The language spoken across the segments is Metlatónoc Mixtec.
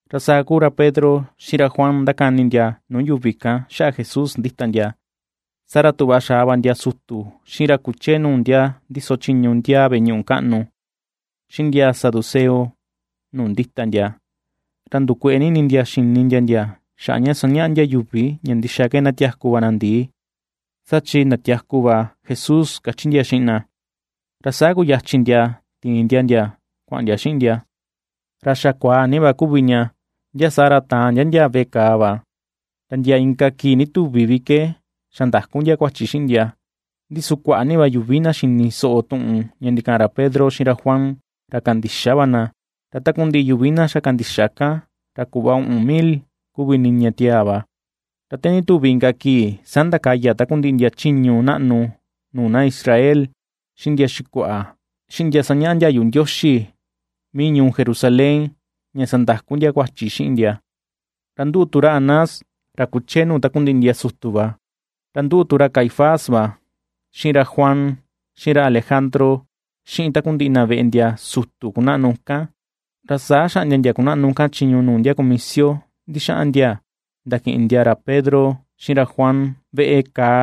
Ra saa kúú ra Pedro xiꞌin ra Juan ^ndakani ndia nuu yuvi kan xaꞌa Jesús ndíta ndia, saa ra tuꞌva xa̱a va ndia sutu, xiꞌin ra kuchee nuu ndia ndíso chiñu ndiaa veꞌe ñuꞌu kaꞌnu, xiꞌin ndia saduceo nuu ndíta ndia, ra ^ndukueꞌe ni ini ndia xini ndia ndia xaꞌa ndia sañaꞌa ndia yuvi ña ndixa ke ndatiaku va na ndii, saa chi ndatiaku va Jesús kachi ndia xiꞌin na. Ra saa kuyachin ndia ti̱in ndia ndia kuaꞌan ndia xiꞌin ndia, ra xa kuaa ni va kuvi ña, ndia saa ra, ta̱àn ndia ndia veꞌe kàà va, ra ndia inka kii ndituvi vi ke xa̱ ndakú ndia kuachi xiꞌin ndia. Ndi su kuaꞌa ni va yuvi na xini soꞌo tuꞌun ña ndikaꞌan ra Pedro xiꞌin ra Juan ra kandixa va na, ra takundiꞌi yuvi na xa kandixa kan ra kuꞌva uꞌun mil kuvi niña tiaa va. Ra te ndituvi inka kii saa ndakaya takundiꞌi ndia chiñu naꞌnu nuu na Israel, xiꞌin ndia xikuaꞌa, xiꞌin ndia ^sañaꞌa ndiayu Ndioxi mii ñuu Jerusalén ña sandakú ndia kuachi xiꞌin ndia; ra nduꞌu tu ra Anás ra kuchee nuu takundiꞌi ndia sutu va, ra nduꞌu tu ra Caifás va xiꞌin ra Juan xiꞌin ra Alejandro, xiꞌin takundiꞌi na veꞌe ndia sutu kunaꞌnu kan. Ra saa xaꞌndia ndia kunaꞌnu kan chiñu nuu ndia kumisio ndixaꞌan ndia ndakiꞌin ndia ra Pedro xiꞌin ra Juan veꞌe kàà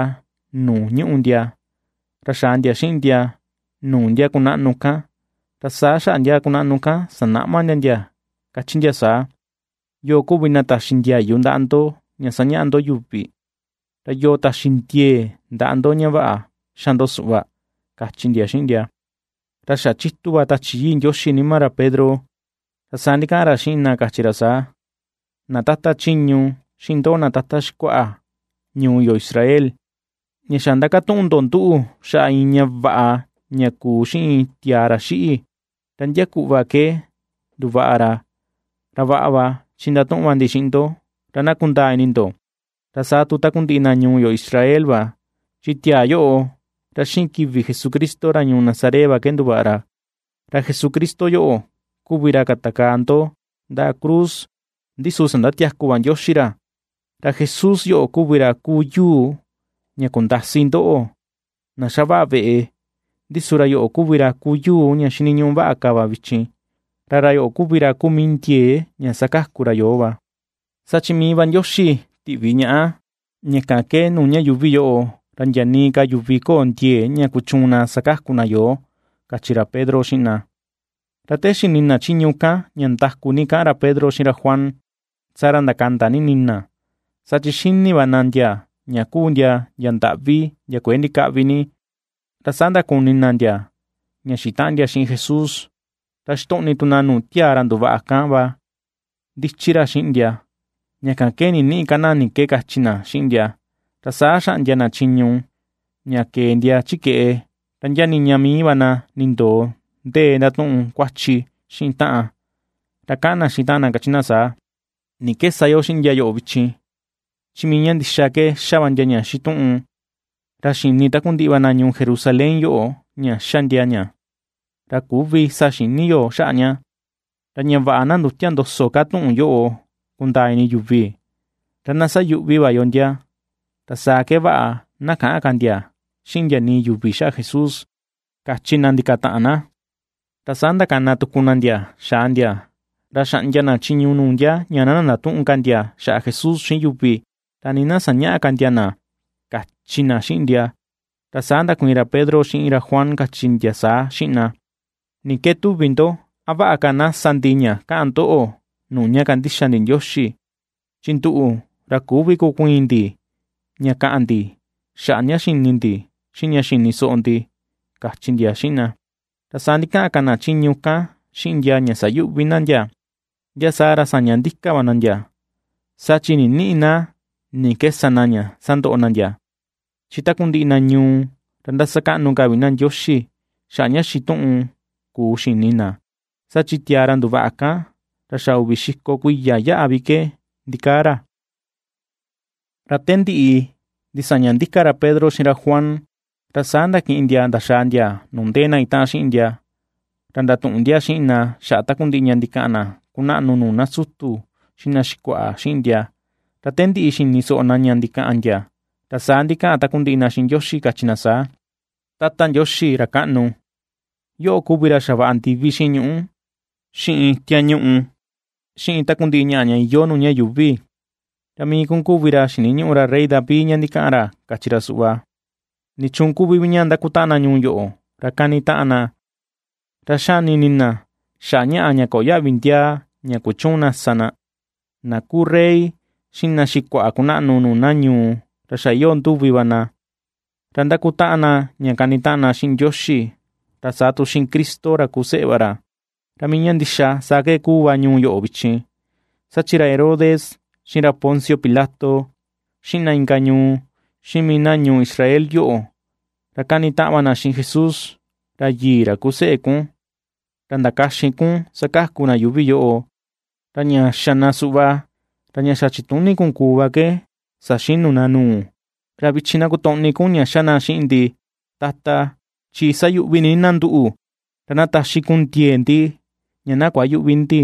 nuu ñuꞌu ndia ra xa̱a̱ ndia xiꞌin ndia nuu ndia kunaꞌnu kan, ra saa xaꞌa ndia kunaꞌnu kan ^sanaꞌma ndia ndia káchí ndia saa: ―¿Yoo kuvi na taxi ndiayu ndaꞌa ndo ña sañaꞌa ndo yuvi? Ra yoo taxi ndiee ndaꞌa ndo ña vaꞌa xa ndo suꞌva? ―kachi ndia xiꞌin ndia. Ra xa chitu va Tachi Yii Ndioxi nima ra Pedro, ra saa ndikaꞌan ra xiꞌin na kachi ra saa: ―Na tata chiñu xiꞌin ndoꞌo na tata xikuaꞌa ñuu yo Israel: Ña xa ndakatuꞌun ndo nduꞌu xaꞌa iin ña vaꞌa ña kuu xiꞌin tiaa ra xiꞌi, ra ndia kuꞌva ke nduvaꞌa ra, ra vaꞌa va chi ndatuꞌun va ndi xiꞌin ndo ra na kundaa ini ndo, ra saa tu takundiꞌi na ñuu yo Israel va, chi tiaa yoꞌo ra xiꞌin kivi Jesucristo ra ñuu Nazaret va ke nduvaꞌa ra. Ra Jesucristo yoꞌo kuvi ra katakaa ndo ndaꞌa cruz, ndi su sandatiaku va Ndioxi ra. Ra Jesús yoꞌo kuvi ra kuu yuu ña kundasi ndoꞌo, na xavaꞌa veꞌe, ndi su ra yoꞌo kuvi ra kuu yuu ña xiniñuꞌu vaꞌa ka va vichin. Ra ra yoꞌo kuvi ra kuu mii ndiee ña sakaku ra yoo va, saa chi mii va Ndioxi tiꞌvi ñaꞌa, ña kan ke nuu ña yuuvi yoꞌo, ra ndia nii ka yuvi köo ndiee ña kuchuun na ña sakaku ña yoo ―kachi ra Pedro xiꞌin na. Ra te xini na chiñu kan ña nda̱ku̱ ni kaꞌan ra Pedro xiꞌin ra Juan, saa ra ndakanda ni ini na, saa chi xini va na ndia ña kuu ndia ndia ndaꞌvi ndia kuëe ndikäꞌvi ni, ra saa ndakuni na ndia ña xitaꞌan ndia xiꞌin Jesús. Ra xitoꞌni tu na nuu tiaa ra nduvaꞌa kan va ndichi ra xiꞌin ndia, ña kan ke nïniꞌi ka na ni ke kachi na xiꞌin ndia. Ra saa xaꞌndia na chiñu ña ke̱e ndia chi keꞌe, ra ndia niña mii va na nindoo ndee ndatuꞌun kuachi xiꞌin taꞌan. Ra kaꞌan na xiꞌin taꞌan na kachi na saa: ―¿Ni ke sa yo xiꞌin ndia yoꞌo vichin? Chi mii ña ndixa ke xa va ndia ña xituꞌun, ra xi̱nì takundiꞌi va na ñuu Jerusalén yoꞌo ña xa ndia ña, ra küvi sa xïni yo xaꞌa ña. Ra ña vaꞌa na ndütia ndoso ka tuꞌun yoꞌo kundaa ini yuvi, ra na sayuꞌvi va yo ndia, ra saa ke vaꞌa na käꞌan ka ndia xiꞌin ndia nii yuvi xaꞌa Jesús ―kachi na ndaka̱ta̱ꞌa̱n na. Ra saa ndakana tuku na ndia xa̱à ndia, ra xaꞌndia na chiñu nuu ndia ña na ndatüꞌun ka ndia xaꞌa Jesús xiꞌin yuvi, ra nii na sañäꞌa ka ndia na, kachi na xiꞌin ndia. Ra saa ndakuiin ra Pedro xiꞌin ra Juan kachi ndia saa xiꞌin na: ―Ni ke tuvi ndo, a vaꞌa ka na sa ndi ña kaꞌan ndoꞌo, nuu ña kandixa ndi Ndioxi, chi nduꞌu, ra küvi kukuiin ndi ña kaꞌan ndi xaꞌa ña xini ndi, xiꞌin ña xini soꞌo ndi ―kachi ndia xiꞌin na. Ra saa ndikaꞌan ka na chiñu kan xiꞌin ndia ña sayuꞌvi na ndia, ndia saa ra sa̱ñá ndíka̱ va na ndia, saa chi ninïꞌi na ni ke sa na ña sándoꞌo na ndia, chi takundiꞌi na ñuu ra ^ndasakaꞌnu ka vi na Ndioxi xaꞌa ña xituꞌun kuu xini na. Saa chi tiaa ra nduvaꞌa kan ra xa uvi xiko kuiya yaꞌa vi ke ndikaa ra. Ra te ndiꞌi ndisaña ndíka̱ ra Pedro xiꞌin ra Juan, ra saa ndakiꞌin ndia ndaxaa ndia nuu ndéé na itaꞌan xiꞌin ndia, ra ndatuꞌun ndia xiꞌin na xaꞌa takundiꞌi ña ndikaꞌan na kunaꞌnu nuu na sutu xiꞌin na xikuaꞌa xiꞌin ndia. Ra te ndiꞌi xini soꞌo na ña ndikaꞌan ndia, ra saa ndikaꞌan takundiꞌi na xiꞌin Ndioxi, kachi na saa: ―Tata Ndioxi ra kaꞌnu, yoꞌo kuvi ra xavaꞌa ndivi xiꞌin ñuꞌú, xiꞌin tiañuꞌu xiꞌin takundiꞌi ñaꞌa ña iyoo nuu ña yuuvi. Ra mii kun kuvi ra xiniñuꞌu ra rey David ña ndikaꞌan ra kachi ra suꞌva: ¿Nichuun kuvi vi ña ndakutaꞌan na ñuu yoꞌo ra kanitaꞌan na ra xani ini na xaꞌa ñaꞌa ña köo yaꞌvi ndiaa ña kuchüun na sa na? Na kuu rey, xiꞌin na xikuaꞌa kunaꞌnu nuu na ñuu ra xa iyoo nduvi na, ra ndakutaꞌan na ña kanitaꞌan na xiꞌin Ndioxi, ra saa tu xiꞌin Cristo ra kuu seꞌe va ra. ’Ra mii ña ndixa saa ke ^kuu va ñuu yoꞌo vichin, saa chi ra Herodes xiꞌin ra Poncio Pilato, xiꞌin na inka ñuu, xiꞌin mii na ñuu Israel yoꞌo, ra kanitaꞌan na xiꞌin Jesús, ra yii, ra kuu seꞌe kun, ra ndakaxin kun sakaku na yuuvi yoꞌo. Ra ña xa na suꞌva, ra ña xa chituni kun kuu va ke saxinu na nuu. Ra vichin na kotoꞌni kun ña xa na xiꞌin ndi, Tata, chi sayuꞌvi ni na nduꞌu; ra na taxi kun ndiee ndi ña na kuayüꞌvi ndi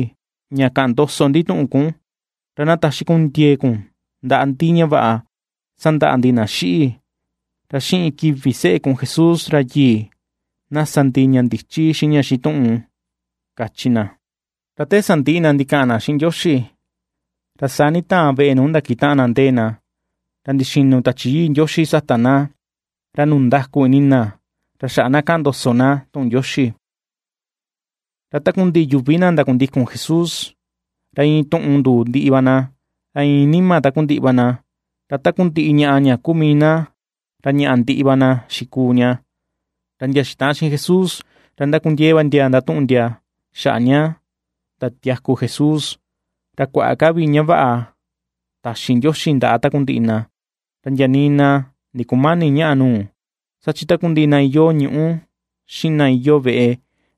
ña kaꞌan ndoso ndi tuꞌun kun; ra na taxi kun ndiee kun ndaꞌa ndi ña vaꞌa sandaꞌa ndi na xiꞌi ra xiꞌin kivi seꞌe kun Jesús ra yii; na sa ndi ña ndichi xiꞌin ña xituꞌun ―kachi na. Ra te sandiꞌi na ndikaꞌan na xiꞌin Ndioxi, ra saa nditaan veꞌe nuu ndakitaꞌan na ndee na, ra ndixinu Tachi Yii Ndioxi sata na, ra nundaku ini na ra xaꞌa na kaꞌan ndoso na tuꞌun Ndioxi. Ra takundiꞌi yuvi na ndakundikun Jesús, ra iin tuꞌun nduu ndiꞌi va na, ra iin nima takundiꞌi va na, ra takundiꞌi ñaꞌa ña kuu mii na, ra ñaꞌa ndiꞌi va na xikuu ña. Ra ndia xitaꞌan xiꞌin Jesús ra ndakundiee va ndia ndatuꞌun ndia xaꞌa ña ndatiaku Jesús, ra kuaꞌa ka vi ña vaꞌa taxi Ndioxi ndaꞌa takundiꞌi na. Ra ndia nii na ndikumäni ñaꞌa nuu, saa chi takundiꞌi na iyoo ñuꞌu xiꞌin na iyoo veꞌe,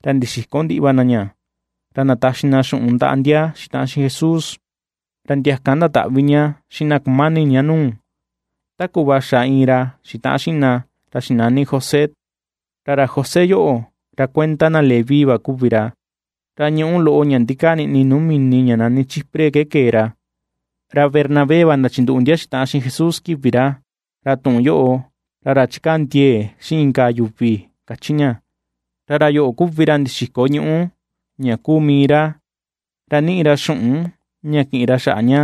ra ndixiko ndiꞌi va na ña ra ndataxi na xuꞌun ndaꞌa ndia xitaꞌan xiꞌin Jesús, ra ndia kan ndataꞌvi ña xiꞌin na kumani ña nuu, ta kuꞌva xa iin ra xitaꞌan xiꞌin na, ra xinani José. Ra ra José yoꞌo ra kuenda na Leví va kuvi ra, ra ñuꞌu loꞌo ña ndikaa niꞌni nuu mini ña nani Chipre ke kee ra, ra Bernabé va ndachinduꞌu ndia xitaꞌan xiꞌin Jesús kivi ra, ra tuꞌun yoꞌo, ra ra chikaa ndiee xiꞌin inka yuvi kachi ña. Ra ra yoꞌo kuvi ra ndixiko ñuꞌu ña kuu mii ra, ra niꞌi ra xuꞌun ña kiꞌin ra xaꞌa ña,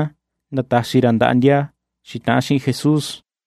ndataxi ra ndaꞌa ndia xitaꞌan Jesús.